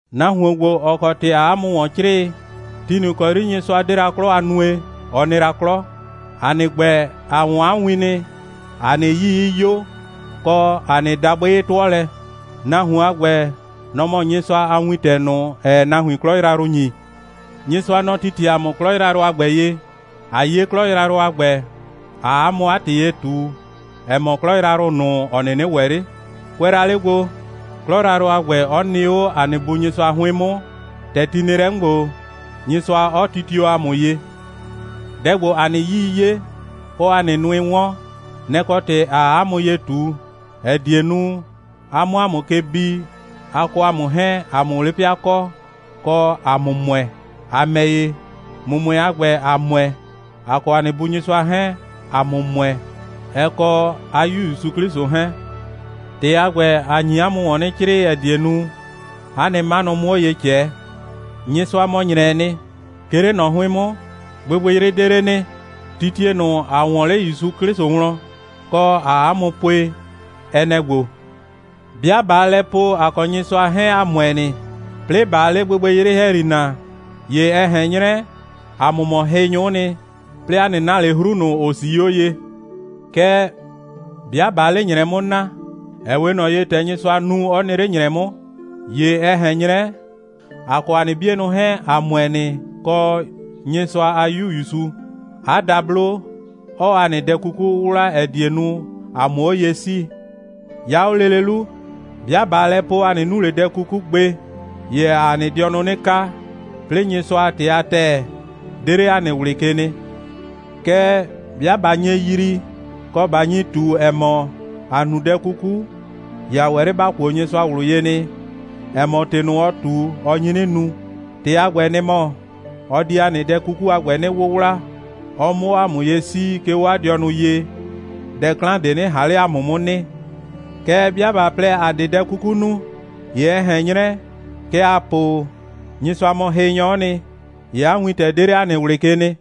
Nahuon ‑gbo, ‑ɔ kɔ ‑tɩ ‑aa 'a mʋ ‑wɔn 'crɩɩ, ti ꞊nʋ ‑kɔ 'yri Nyɩsʋa 'de la 'klɔ a nue, ɔ nɩ la 'klɔ. ‑A nɩ ‑gbɛ, ‑a 'wɔn 'a win nɩ, ‑a nɩ 'yii 'ɩ 'yo, kɔ, ‑a nɩ dabʋɩ 'ɩ 'tʋɔ lɛ. Nahuon a ‑gbɛ, nɔ‑ mɔ Nyɩsʋa a Wintɛ ꞊nʋ, ‑ɛɛ nahuin 'klɔ yrayrʋ ‑nyi. Nyɩsʋa, nɔ‑ titie ‑a mʋ 'klɔ yrayrʋ a ‑gbɛ ye, ꞊a 'ye 'klɔ yrayrʋ a ‑gbɛ, ꞊aa 'a mʋ 'a ‑tɩ ye ꞊tu, ‑ɛ mɔ 'klɔ yrayrʋ ꞊nʋ, ‑ɔ 'nɩnɩ ‑wɛ 'le. Kʋɛ la 'le gbo, 'klɔ yrayrʋ a ‑gbɛ 'ɔ nɩ 'o ‑a nɩ Bu Nyɩsʋa 'hʋɩn 'mʋ, ‑tɛ ti nɩ lɛ 'mʋ ‑gbo, Nyɩsʋa 'ɔ titio ‑a mʋ ye. Dɛ ‑gbo, ‑a nɩ 'yii 'ye, kɔ ‑a nɩ nʋɩ 'wɔn, nɛ‑ kɔ ‑tɩ ‑aa 'a mʋ ye ꞊tu, ‑ɛ die nu, a 'mʋ ‑a mʋ ke bi, a kɔ ‑a mʋ 'hɛɛn, ‑a 'mʋ 'le 'pɩa kɔ, kɔ, ‑a 'mʋ ‑mʋɛ. ‑A ‑mɛ ‑ye, ‑mʋmʋɛ a ‑gbɛ, ‑a ‑mʋɛ, ‑a kɔ ‑a nɩ Bu Nyɩsʋa 'hɛɛn, ‑a mʋ ‑mʋɛ, ɛ kɔ 'a 'Yu ‑Yusu 'Klɩsʋ 'hɛɛn. ‑Tɩ a ‑gbɛ, ‑a nyi 'a mʋ ‑wɔn 'nɩ 'crɩɩ, ‑ɛ die nu, ‑a nɩ 'manʋ 'mʋ 'o ye ꞊cɛɛ. Nyɩsʋa mɔ ‑nyrɛɛ nɩ. 'Ke 'le ꞊nɔ 'hʋɩn 'mʋ, gbɩgbɩyrɩ 'de 'le nɩ. Titie ꞊nʋ, ‑a 'wɔɔn 'le ‑Yusu 'Klɩsʋ wlɔn, kɔ, ‑aa 'a mʋ pue, ɛ nɛ‑ ‑gbo: 'Bɩa ꞊baa lɛ po, ‑a kɔ Nyɩsʋa 'hɛɛn, ‑a ‑mʋɛ nɩ, 'plɩɩ ꞊baa 'le gbɩgbɩyrɩ ‑hɛyri na, ‑ye ɛ ꞊hɛn 'nyrɛ, ‑a mʋ mɔ hɩnyʋ'ʋ nɩ, 'plɩɩ ‑a 'nɩ na ꞊le 'hru ꞊nʋ, ‑ʋ 'sii 'o ye. Kɛɛ, 'bɩa ꞊baa 'le ‑nyrɛ 'mʋ na, ‑ɛ 'we ꞊nɔ ye, ‑tɛ Nyɩsʋa nu, 'ɔ nɩ 'le ‑nyrɛ 'mʋ, ‑ye ɛ ꞊hɛn 'nyrɛ, ‑a kɔ ‑a nɩ 'bienʋ 'hɛɛn, ‑a ‑mʋɛ nɩ, kɔ, Nyɩsʋa a 'Yu ‑Yusu, 'a dablo, 'ɔɔ ‑a nɩ dɛ 'kuku 'wʋwla, ‑ɛ die nu, ‑a 'mʋ 'o ye 'sii. 'Ya 'o lele 'lu, 'bɩa ꞊baa lɛ po, ‑a 'nɩ nu ꞊le dɛ 'kuku gbe, ‑ye ‑aa ‑a dɩɔnʋ 'nɩ kaa, 'plɩɩ Nyɩsʋa a ‑tɩ a ‑tɛɛ 'de 'le ‑a nɩ ꞊wlɩ ke nɩ. Kɛɛ, 'bɩa ꞊ba nye yrii, kɔ, ꞊ba nyi ꞊tu, ‑ɛ mɔ, ‑a nu dɛ 'kuku, ‑ye ‑a ‑wɛ 'le ‑ba kuo Nyɩsʋa ꞊wlʋ ye nɩ, ‑ɛ mɔ, ‑tɩ ꞊nʋ, ɔ ꞊tu, ɔ nyi 'nɩ nu. ‑Tɩ a ‑gbɛ, nɩ‑ mɔ, ɔ di ‑a nɩ dɛ 'kuku a ‑gbɛ 'nɩ 'wʋwla, ɔ 'mʋ 'o ‑a mʋ ye 'sii, 'ke 'o 'a dɩɔnʋ ye, dɛ 'klan ꞊de 'nɩ ꞊han 'le ‑a mʋ 'mʋ nɩ. Kɛɛ, 'bɩa ꞊ba plɛ, ‑a 'de dɛ 'kuku nu, ‑ye ɛ ꞊hɛn 'nyrɛ, kɛ ‑aa po, Nyɩsʋa mɔ hɩnyɔ'ɔ nɩ, ‑ye 'a wintɛ 'de 'le ‑a nɩ ꞊wlɩ ke nɩ.